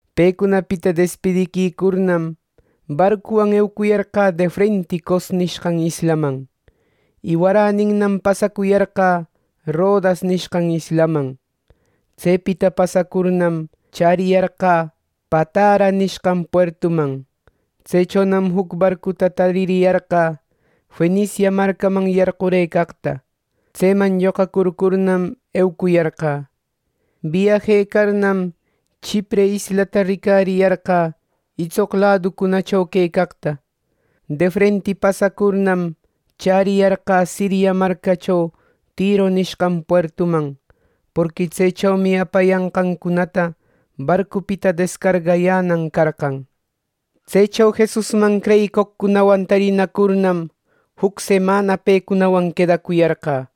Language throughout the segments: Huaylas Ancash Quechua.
Pecunapita despidiquicurnam, barcuwan eucuyarqä defrenti Cos nishqan islaman. Y waräninnam pasacuyarqä Rodas nishqan islaman. Tsepita pasacurnam, chäriyarqä Patara nishqan puertuman. Tsechonam juc barcuta taririyarqä Fenicia marcaman yarqurëcaqta. Tseman lloqarcurnam, eucuyarqä. Biyajecarnam, Chipre islata ricariyarqä itsoq laducunacho quecaqta. Defrenti pasacurnam, chäriyarqä Siria marcacho Tiro nishqan puertuman; porqui tsechomi apayanqancunata barcupita descargayänan carqan. Tsecho Jesusman creyicoqcunawan tarinacurnam, juc semana pecunawan quedacuyarqä.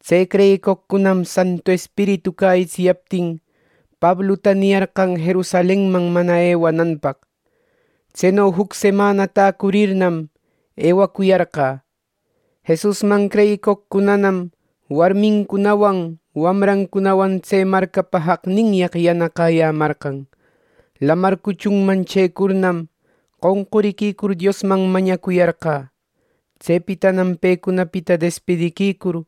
Tse creyicoqcunam Santu Espiritu cäyitsiyaptin Pabluta niyarqan Jerusalenman mana ewananpaq. Tseno juc semana täcurirnam, ewacuyarqä. Jesusman creyicoqcunanam warmincunawan wamrancunawan tse marcapa jaqninyaq yanaqäyämarqan. Lamar cuchunman chëcurnam, qonqurïcur Diosman mañacuyarqä. Tsepitanam pecunapita despidiquicur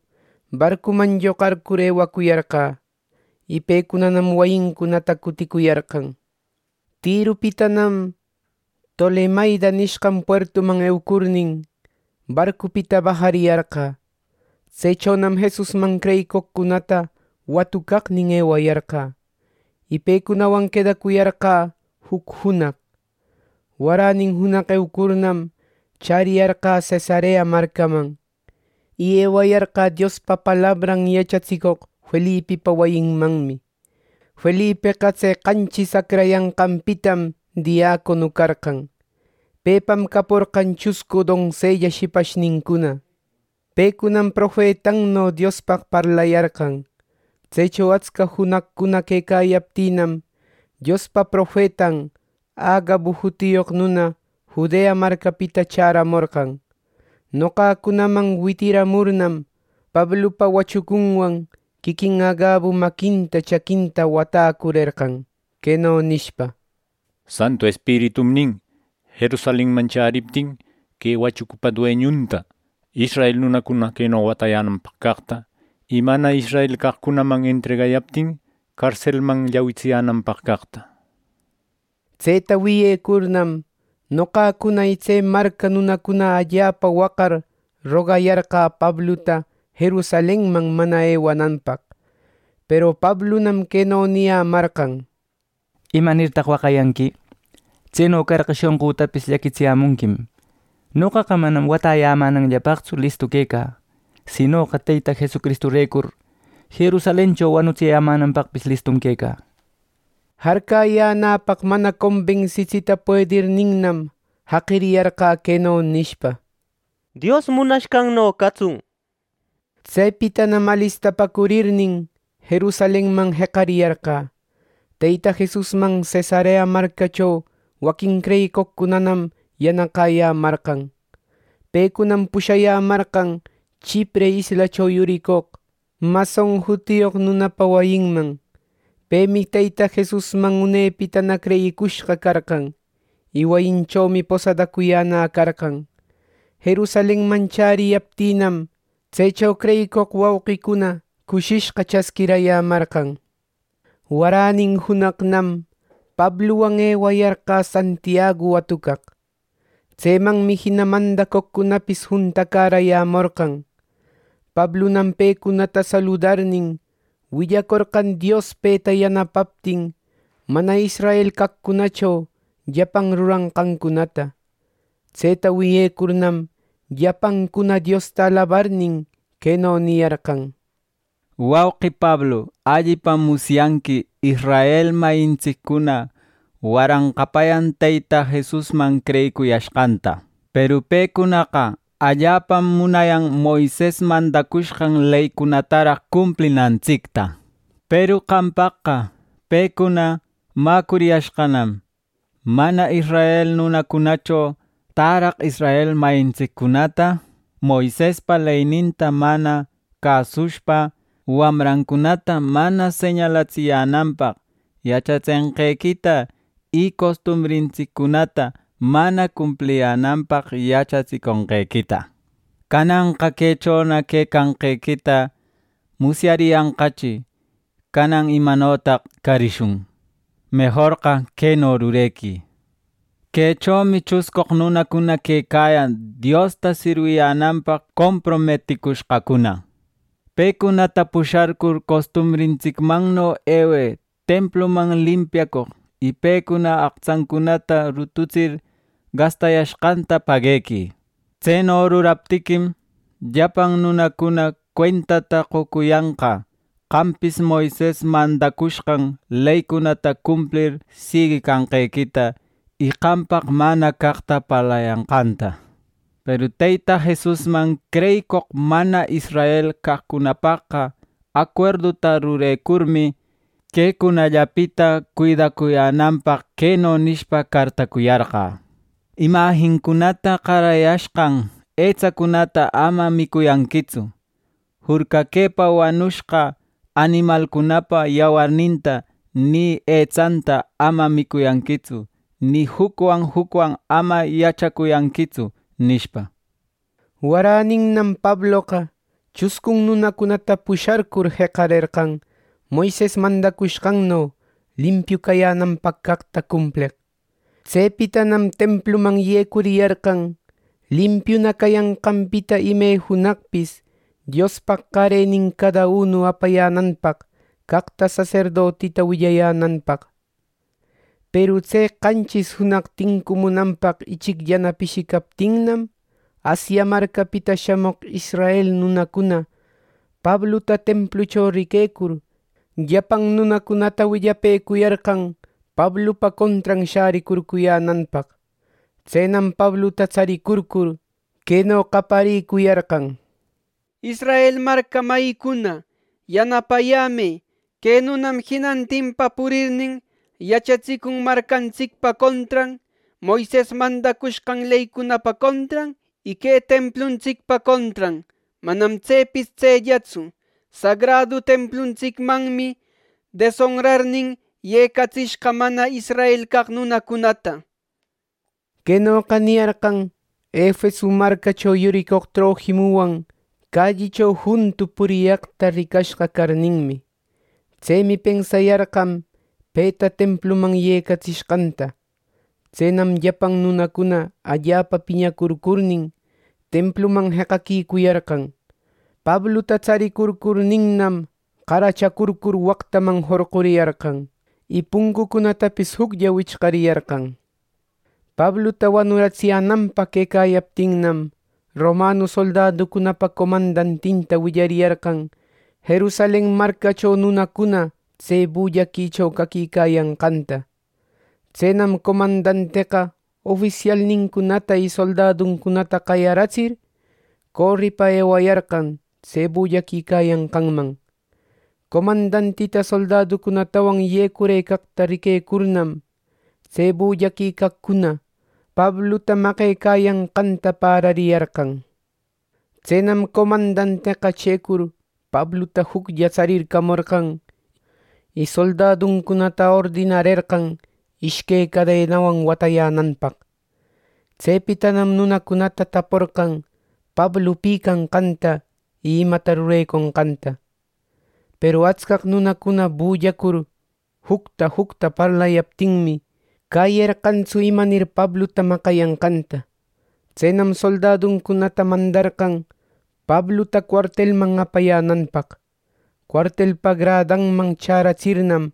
barcuman lloqarcur eucuyarqä. Y pecunanam wayincunata cuticuyarqan. Tiropitanam Tolemaida nishqan puertuman eucurnin, barcupita bajayarqä. Tsechonam Jesusman creyicoqcunata watucaqnin ewayarqä, y pecunawan quedacuyarqä juc junaq. Waränin junaq eucurnam, chäriyarqä Cesarea marcaman. Y ewayarqä Diospa palabran yachatsicoq Felipipa wayinmanmi. Felipeqa tse qanchis acrayashqanpita diacono carqan. Pepam caporqan chuscu donsella shipashnincuna; pecunam profetanno Diospaq parlayarqan. Tsecho atsca junaqcuna quecayaptïnam, Diospa profetan Agabu jutiyoq nuna Judea marcapita chäramorqan. Noqacunaman witiramurnam, Pablupa wachucunwan quiquin Agabu maquinta chaquinta watäcurerqan queno nishpa: —Santu Espiritum nin, ‘Jerusalenman chäriptin que wachucupa dueñunta israel nunacuna queno watayänanpaq caqta y mana israel caqcunaman entregayaptin carselman llawitsiyänanpaq caqta.’ Tseta wiyecurnam, noqacuna y tse marca nunacuna allapa waqar rogayarqä Pabluta Jerusalenman mana ewananpaq. Peru Pablunam queno niyämarqan: —¿Imanirtaq waqayanqui? Tseno carqa, shonqütapis llaquitsiyämunquim. Noqaqa manam watayämänanllapaqtsu listu quecä; sinoqa Teyta Jesusrecur Jerusalencho wanunapaqpis listum quecä —nishpa. Jarcäyänäpaq mana conbensitsita puedirninnam, jaqiriyarqä queno nishpa: “Dios munashqanno catsun” nir. Tsepitanam alistapäcurirnin, Jerusalenman jeqariyarqä. Teyta Jesusman Cesarea marcacho waquin creyicoqcunam yanaqäyämarqan. Pecunam pushayämarqan Chipre islacho yuricoq Mnason jutiyoq nunapa wayinman. Pemi Teyta Jesusman unepitana creyicushqa carqan, y wayinchomi posadacuyäna carqan. Jerusalenman chäriyaptïnam, tsecho creyicoq wauqicuna cushishqa chasquirayämarqan. Waränin junaqnam Pabluwan ewayarqä Santiagu watucaq. Tsemanmi jina mandacoqcunapis juntacäräyämorqan. Pablunam pecunata saludarnin, willacorqan Dios peta yanapaptin, mana israel caqcunacho llapan ruranqancunata. Tseta wiyecurnam, llapancuna Diosta alabarnin, queno niyarqan: —Wauqi Pablu, allipam musyanqui israel mayintsiccuna waranqapayan Teyta Jesusman creyiquicuyashqanta. Peru pecunaqa allapam munayan Moises mandacushqan leycunataraq cumplinantsicta. Peru qampaqqa pecuna mäcuriyashqannam, mana israel nunacunacho täraq israel mayintsiccunata, Moisespa leyninta mana cäsushpa, wamrancunata mana señalatsiyänanpaq yachatsenqequita y costumbrintsiccunata mana cumpliyänanpaq yachatsiconqequita. “¡Cananqa quechona quecanqequita musyariyanqachi! ¡Canan imanotaq carishun! Mejorqa queno rurequï: Quechomi chuscoq nunacuna quecayan Diosta sirwiyänanpaq comprometicushqacuna. Pecunata pusharcur costumbrintsicmanno ewë templuman limpiacoq, y pecuna aqtsancunata rututsir gastayanqanta paguequï. Tseno ruraptiquim, llapan nunacuna cuentata qocuriyanqa qampis Moises mandacushqan leycunata cumplir siguicanqequita y qampaq mana caqta parlayanqanta. Peru Teyta Jesusman creyicoq mana israel caqcunapaqqa acuerduta rurecurmi, quecunallapita cuidacuyänanpaq queno nishpa cartacuyarqä: ‘Imajincunata qarayashqan etsacunata ama micuyänquitsu, jurcaquëpa wanushqa animalcunapa yawarninta ni etsanta ama micuyanquitsu ni jucwan jucwan ama yachacuyanquitsu’” nishpa. Waräninnam Pabloqa chuscun nunacunata pusharcur jeqarerqan Moises mandacushqanno limpiu cayänanpaq caqta cumpleq. Tsepitanam templuman yecuriyarqan limpiuna cayanqanpita ime junaqpis Diospaq qarenin cada unu apayänanpaq caqta saserdotita willayänanpaq. Peru tse qanchis junaq tincumunanpaq ichicllana pishicaptinnam, Asia marcapita shamoq israel nunacuna Pabluta templucho riquecur llapan nunacunata willapëcuyarqan Pablupa contran shäricurcuyänanpaq. Tsenam Pabluta tsaricurcur, queno qaparïcuyarqan: “Israel marca mayïcuna, yanapayämë. Que nunam jinantinpa purirnin, yachatsicun marcantsicpa contran, Moises mandacushqan leycunapa contran y que templuntsicpa contran. Manam tsepis tsellatsu, sagradu templuntsicmanmi desonrarnin, yecatsishqa mana israel caq nunacunata” nir. Quenoqa niyarqan Efeso marcacho yuricoq Trofimuwan callicho juntu puriyaqta ricashqa carninmi, tsemi pensayarqan peta templuman yecatsishqanta. Tsenam llapan nunacuna allapa piñarcurnin, templuman jeqaquicuyarqan. Pabluta tsarircurninnam qaracharcur waqtaman jorquriyarqan. Y puncucunatapis juclla wichariyarqan. Pabluta wanuratsiyänanpaq quecayaptinnam, romanu soldaducunapa comandantinta willariyarqan Jerusalen marcacho nunacuna tse bullaquicho caquicayanqanta. Tsenam comandanteqa ofisialnincunata y soldaduncunata qayaratsir, coripa ewayarqan tse bullaquicayanqanman. Comandantita soldaducunatawan yecurëcaqta riquecurnam, tse bullaquicaqcuna Pabluta maqecayanqanta pärariyarqan. Tsenam comandanteqa chëcur Pabluta juclla tsarircamorqan y soldaduncunata ordinarerqan ishque cadenawan watäyänanpaq. Tsepitanam nunacunata taporqan Pablu pi canqanta y imata rureconqanta. Peru atscaq nunacuna bullacur jucta jucta parlayaptinmi, cäyerqantsu imanir Pabluta maqayanqanta. Tsenam soldaduncunata mandarqan Pabluta cuartelman apayänanpaq. Cuartelpa gradanman chäratsirnam,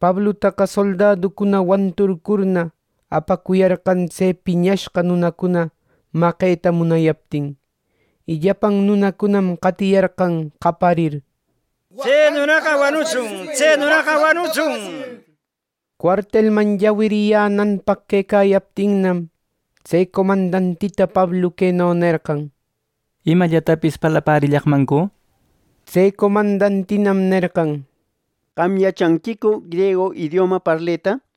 Pablutaqa soldaducuna wanturcurna, apacuyarqan tse piñashqa nunacuna maqeta munayaptin. Y llapan nunacunam qatiyarqan qaparir “¡Tse nunaqa wanutsun! ¡Tse nunaqa wanutsun!” nishpa. Cuartelman llawiriyänanpaq quecayaptinnam, tse comandantita Pablu queno nerqan: —¿Imallatapis parlapärillaqmancu? —nishpa. Tse comandantinam nerqan: —¿Qam yachanquicu griegu idioma parleta?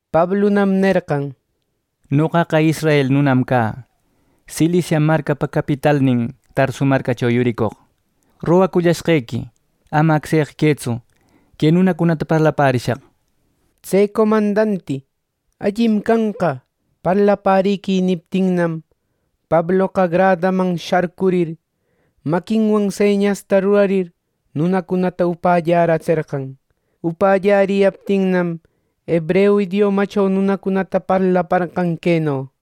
Pablunam nerqan: —Noqaqa israel nunam cä, Cilicia marcapa capitalnin Tarsu marcacho yuricoq. Rogacushqequi: Ama acseqa quëtsu que nunacunata parlapärishaq. Tse comandanti “Allim canqa, parlapäriquï” niptinnam, Pabloqa gradaman shacurir, maquinwan señasta rurarir nunacunata upälläratserqan. Upalläriyaptinnam hebreu idiomacho nunacunata parlaparqan queno: